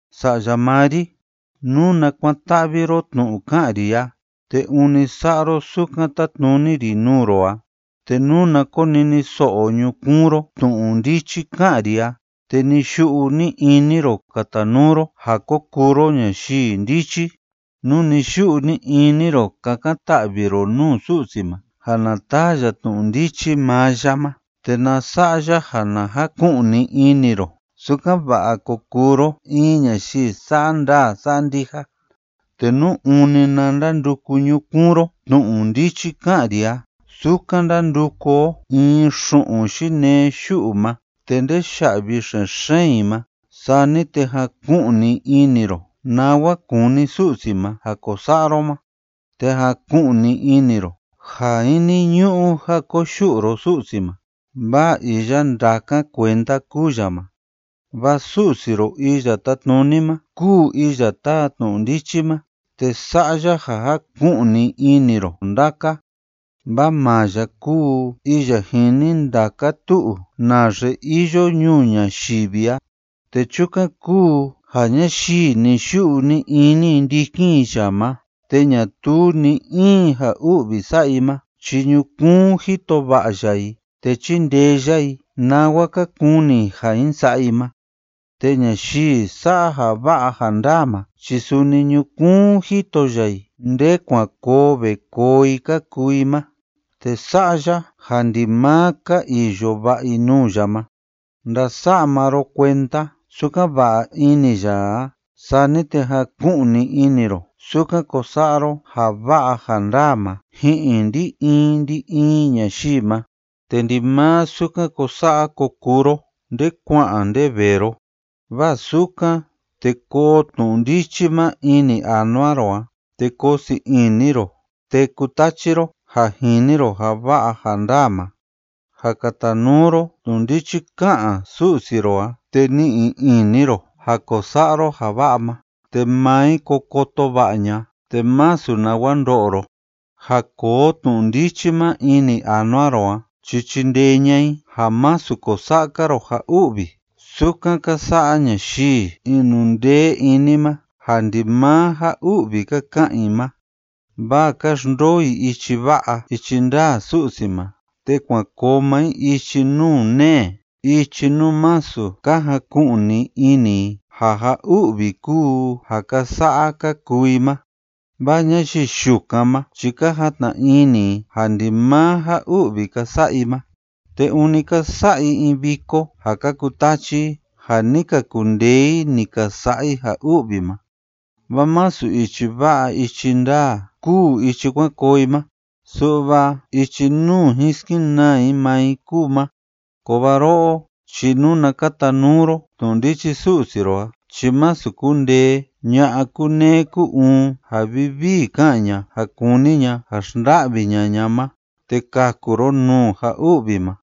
Sa'ya maa ri, nuna kuan‑ta'vi ro tnu'u ka'an ri a te ûni sa'a ro sukan tátnuni ri nuu ro a, te nuna koniniso'o ñukuun ro tnu'u ndichi ká'an ri a te ni‑yu'u ni‑ini ro katanuu ro ja ko kuu ro ñayii ndichi, nú ni‑yu'u ni‑ini ro kakan‑ta'vi ro nuu Su'si ma ja na taa ya tnu'u ndichi maa ya ma te na sa'a ya ja na jaku'ni ini ro, sukan‑va'a ko kuu ro in ñayii sa'a ndaa sa'a ndija, te nú ûni na ndanduku ñukuun ro tnu'u ndichi ká'an ri a sukan ndánduku o in xu'un yinee yu'u ma te ndeya'vi xen‑xeen i ma, sani te jaku'ni ini ro nawa kúni Su'si ma ja ko sa'a ro ma, te jaku'ni ini ro ja jiniñu'u ja koyu'u ro Su'si ma, vaa iya ndákan kuenda kúu ya ma. Vaa Su'si ro Iya Tátnuni ma kúu iya táa tnu'u ndichi ma te sa'a ya ja jaku'ni ini ro ndaka. Vaa maa ya kúu iya jini ndaka tu'u naxe iyo ñuu ñayivi a. Te chukan kúu ja ñayii ni‑yu'u ni‑ini i ndikin i ya ma te ñatuu ni‑in ja u'vi sa'a i ma chi ñukuun jito va'a ya i, te chíndee ya i nawa ka kuni i ja jin sa'a i ma. Te ñayii sa'a ja va'a ja ndaa ma chi suni ñukuun jito ya i nde kuan koo ve koo i ka kuu i ma, te sa'a ya ja ndimaa ka iyo va'a i nuu ya ma. Ndasa'a maa ro kuenda sukan va'a ini ya a, sani te jaku'ni ini ro sukan ko sa'a ro ja va'a ja ndaa ma ji'in ndi‑in ndi‑in ñayii ma, te ndimaa sukan ko sa'a ko kuu ro nde kua'an nde vee ro. Vaa sukan, te koo tnu'u ndichi ma ini anua ro a, te koo sii ini ro, te kutachi ro ja jini ro ja va'a ja ndaa ma. Ja katanuu ro tnu'u ndichi ká'an Su'si ro a te ni'i ini ro ja ko sa'a ro ja va'a ma, te maa i ko koto va'a ña'a, te masu nawa ndo'o ro. Ja koo tnu'u ndichi ma ini anua ro a chi chindee ña'a i ja másu ko sa'a‑ka ro ja u'vi sukan ka sa'a ñayii inundee ini ma ja ndimaa ja u'vi ka ka'an i ma. Vaa ka xndoo i ichi va'a ichi ndaa Su'si ma te kuan koo maa i ichi nuu nee, ichi nuu masu ka jaku'ni ini i ja ja u'vi kúu ja ka sa'a ka kuu i ma. Vaa ñayii yukan ma chi ka jatna ini i ja ndimaa ja u'vi ka sa'a i ma. Te ûni ka sa'a i in viko ja ka kutachi i ja ni ka kundee i ni ka sa'a i ja u'vi ma. Vaa masu ichi va'a ichi ndaa kúu ichi kuan koo i ma, su'va ichi nuu jin skenaa i maa i kúu ma. Kovaa ro'o chi nuna katanuu ro tnu'u ndichi Su'si ro a chi masu kundee ña'a kúneé kú‑uun ja vivii ká'an ña ja kúni ña ja xnda'vi ña'a ña ma; te kaku ro nuu ja u'vi ma.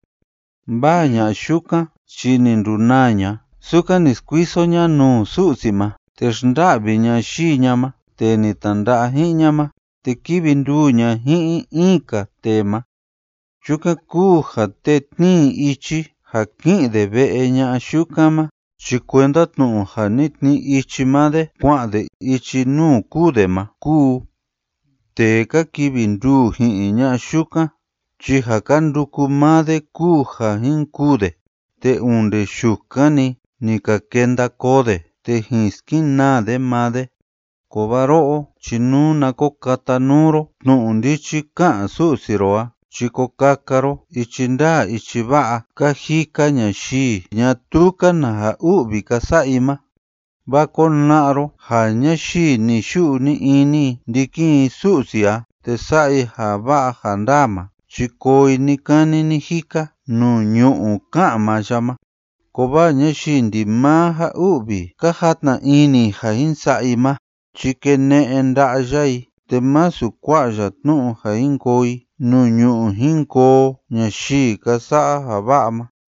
Vaa ña'a yukan chi ni ndunaa ña sukan ni skuiso ña nuu Su'si ma, te xnda'vi ña yii ña ma, tee ni tnanda'a ji'in ña ma, te kívi nduu ña ji'in in‑ka tee ma. Chukan kúu ja tee tnii ichi ja ki'in de ve'e ña'a yukan ma chi kuenda tnu'u ja ni tnii ichi maa de kua'an de ichi nuu kûu de ma kúu. Tee ka kivi nduu ji'in ña'a yukan chi ja ka nduku maa de kúu ja jin kûu de, te onde yukan‑ni ni ka kenda koo de te jin skenaa de maa de. Kovaa ro'o chi nuna ko katanuu ro tnu'u ndichi ká'an Su'si ro a chi ko kaka ro ichi ndaa ichi va'a ka jika ñayii ñatuu‑ka na ja u'vi ka sa'a i ma. Vaa kona'a ro ja ñayii ni‑yu'u ni‑ini i ndikin i Su'si a te sa'a i ja va'a ja ndaa ma chi koo i ni‑kani ni‑jika nuu ñu'ú ká'an maa ya ma. Kovaa ñayii ndimaa ja u'vi ka jatna ini i ja jin sa'a i ma chi kene'e nda'a ya i, te masu kua'a ya tnu'u ja jin koo i nuu ñu'ú jin koo ñayii ka sa'a ja va'a ma.